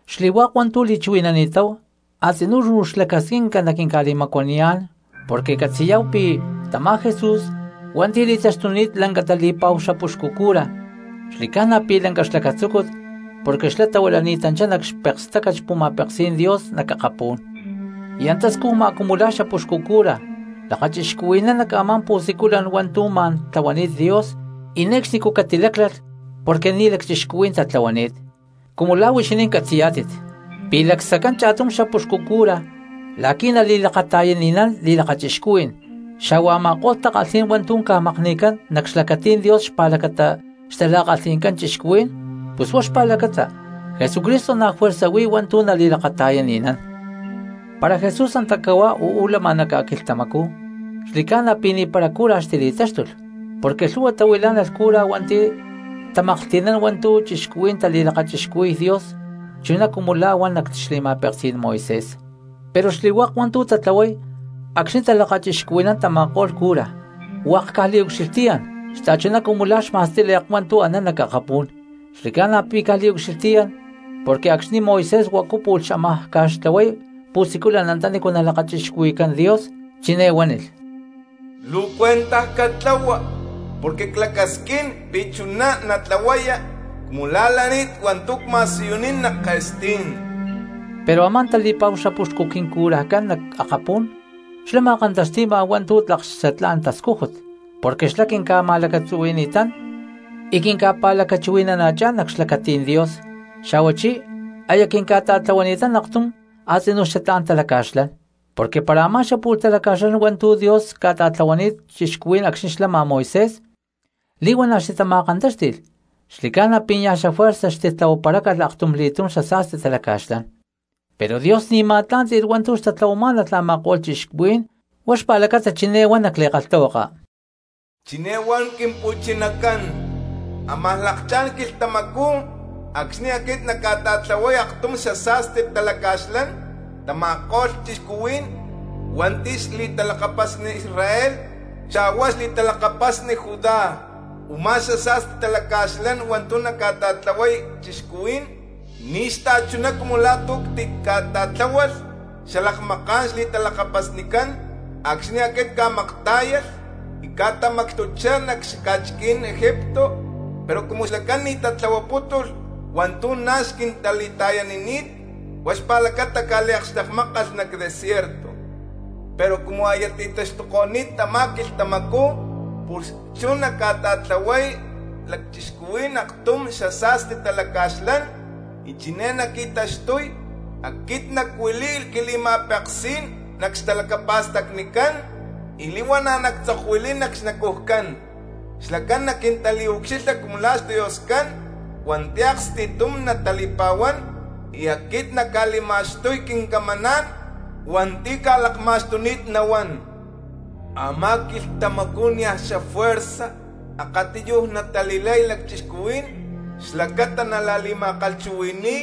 Xli̠hua̠k hua̠ntu̠ li̠chuhui̠nani̠táhu a̠tzinú luu xlacasquinca naquinca̠li̠macuaniyá̠n porque catzi̠yá̠hu pi̠ tamá Jesús hua̠nti̠ li̠taxtuni̠t lanca tali̠pa̠hu xapuxcu cura xli̠ca̠na pi̠ lanca xlacatzúcut porque xlá tahuilani̠tanchá nac xpekstácat xpu̠ma̠peksí̠n Dios nac akapú̠n, y antá scujma cumu la̠ xapuxcu cura lakachixcuhui̠nán nac a̠má pu̠siculan hua̠ntu̠ ma̠n tlahuani̠t Dios y ne̠cxnicú catiláclalh porque ni̠ lacchixcuhuí̠n tatlahuani̠t. Cumu la̠ huixinín catzi̠yá̠tit pi̠ lacsaccán cha̠tum xapuxcu cura la̠qui̠ nali̠lakata̠yani̠nán li̠lakachixcuhuí̠n xa̠hua a̠ma̠ko̠lh takalhí̠n hua̠ntu̠ ca̠makni̠cán nac xlacatí̠n Dios xpa̠lacata xtala̠kalhi̠ncán cristianos, pus huá xpa̠lacata Jesucristo na̠ juerza huí hua̠ntu̠ nali̠lakata̠yani̠nán. Para Jesús antacú cahuá uú lama nac ca̠quilhtamacú xli̠ca̠na pi̠ ni̠para cura xtili̠táxtulh porque lhu̠hua tahuilá̠nalh cura hua̠nti̠ tamaklhti̠nán hua̠ntu̠ cristianos tali̠lakachixcuhui̠y Dios chuná cumu la̠ huan nac xli̠ma̠peksí̠n Moisés. Pero xli̠hua̠k hua̠ntu̠ tatlahuay acxni̠ talakachixcuhui̠nán tama̠ko̠lh cura hua̠k caj liucxilhtiyán xta̠chuná cumu lá xma̠stíle̠k hua̠ntu̠ anán nac akapú̠n. Xli̠ca̠na pi̠ caj liucxilhtiyán porque acxni̠ Moisés huacu pu̠lh xámaj ca̠xtlahuay pu̠siculan antanícu nalakachixcuhui̠cán Dios chiné huánilh: “Luu cuentaj catlahua porque clacasquín pi̠ chuná natlahuaya cumu lá lani̠t hua̠ntu̠ cma̠siyunín nac ke̠stí̠n.” Pero a̠má tali̠pa̠hu xapuxcu quincurajcán nac akapú̠n xlá ma̠kantaxti̠ma hua̠ntu̠ tlak xatlá̠n tascújut, porque xlá quinca̠ma̠lacatzuhui̠ni̠tán y quinca̠pa̠lacachuhui̠nana̠chá̠n nac xlacatí̠n Dios, xa̠huachí aya quinca̠ta̠tlahuani̠tán aktum a̠tzinú xatlá̠n talaca̠xlán. Porque para a̠má xapu̠lh talaca̠xlán hua̠ntu̠ Dios ca̠ta̠tlahuani̠t cristianos acxni̠ xlama Moisés li̠huana̠ xtitama̠kantáxti̠lh, xli̠ca̠na pi̠ niaj xafuerza xtitlahuaparácalh aktumli̠túm xasa̠sti talaca̠xlán. Pero Dios ni̠ ma̠tlá̠nti̠lh hua̠ntu̠ xtatlahuamá̠nalh a̠ma̠ko̠lh cristianos huá xpa̠lacata chiné huan nac li̠kalhtahuaka: Chiné huan Quimpu̠chinacán: Amaj lakchá̠n quilhtamacú acxni̠ aquit nacca̠ta̠tlahuay aktum xasa̠sti talaca̠xlán tama̠ko̠lh cristianos hua̠nti̠ xli̠talakapasni Israel xa̠hua xli̠talakapasni Judá. Umá xasa̠sti talaca̠xlán hua̠ntu̠ nacca̠ta̠tlahuay cristianos ni̠ xta̠chuná cumu la̠ tu̠ ctica̠ta̠tláhualh xalakmaká̠n xli̠talakapasnicán acxni̠ aquit cca̠maktá̠yalh y cca̠tamacxtuchá nac xaca̠chiquí̠n Egipto; pero cumu xlacán ni̠ tatlahuapútulh hua̠ntu̠ na̠ xquintali̠ta̠yanini̠t, huá xpa̠lacata cca̠liakxtekmákalh nac desierto. Pero cumu aya ti̠taxtuko̠ni̠t tamá quilhtamacú, pus chú nacca̠ta̠tlahuay cristianos aktum xasa̠sti talaca̠xlán, y chiné naqui̠taxtuy: Aquit nacuili̠y quili̠ma̠peksí̠n nac xtalacapa̠stacnicán, y li̠huana̠ nactzokuili̠y nac xnacujcán. Xlacán naquintaliucxilha cumu la̠ xDioscán hua̠nti̠ aksti̠tum natali̠pa̠huán, y aquit nacca̠li̠ma̠xtuy quincamaná̠n hua̠nti̠ cca̠lakma̠xtuni̠t nahuán. Amá quilhtamacú niaj xafuerza akatiyuj natali̠lay cristianos xlacata nala̠li̠ma̠kalhchuhui̠ni̠y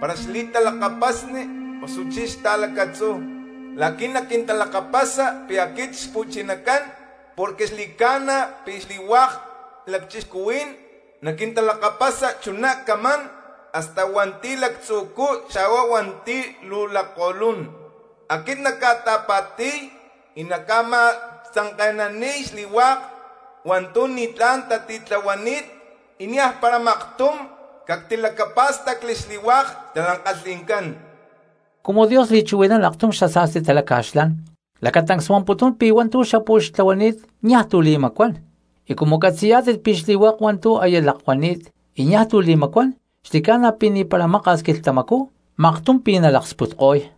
para xli̠talakapasni osuchí xta̠lacatzú, la̠qui̠ naquintalakapasa pi̠ aquit Xpu̠chinacán, porque xli̠ca̠na pi̠ xli̠hua̠k cristianos naquintalakapasa chuná camán hasta hua̠nti̠ lactzu̠cú xa̠hua hua̠nti̠ luu lakko̠lún. Aquit nacca̠ta̠pa̠ti̠y y nacca̠ma̠tzanke̠naniy xli̠hua̠k hua̠ntu̠ ni̠tlá̠n tatitlahuani̠t, y niaj para maktum cactilacapá̠stacli xli̠hua̠k xtala̠kalhi̠ncán. Cumu Dios li̠chuhui̠nán aktum xasa̠sti talaca̠xlán, lacatancs huamputún pi̠ hua̠ntu̠ xapu̠lh xtlahuani̠t niaj tu̠ li̠macuán; y cumu catzi̠yá̠tit pi̠ xli̠hua̠k hua̠ntu̠ aya lakuani̠t y niaj tu̠ li̠macuán xli̠ca̠na pi̠ ni̠para maka̠s quilhtamacú maktum pi̠ nalaksputko̠y.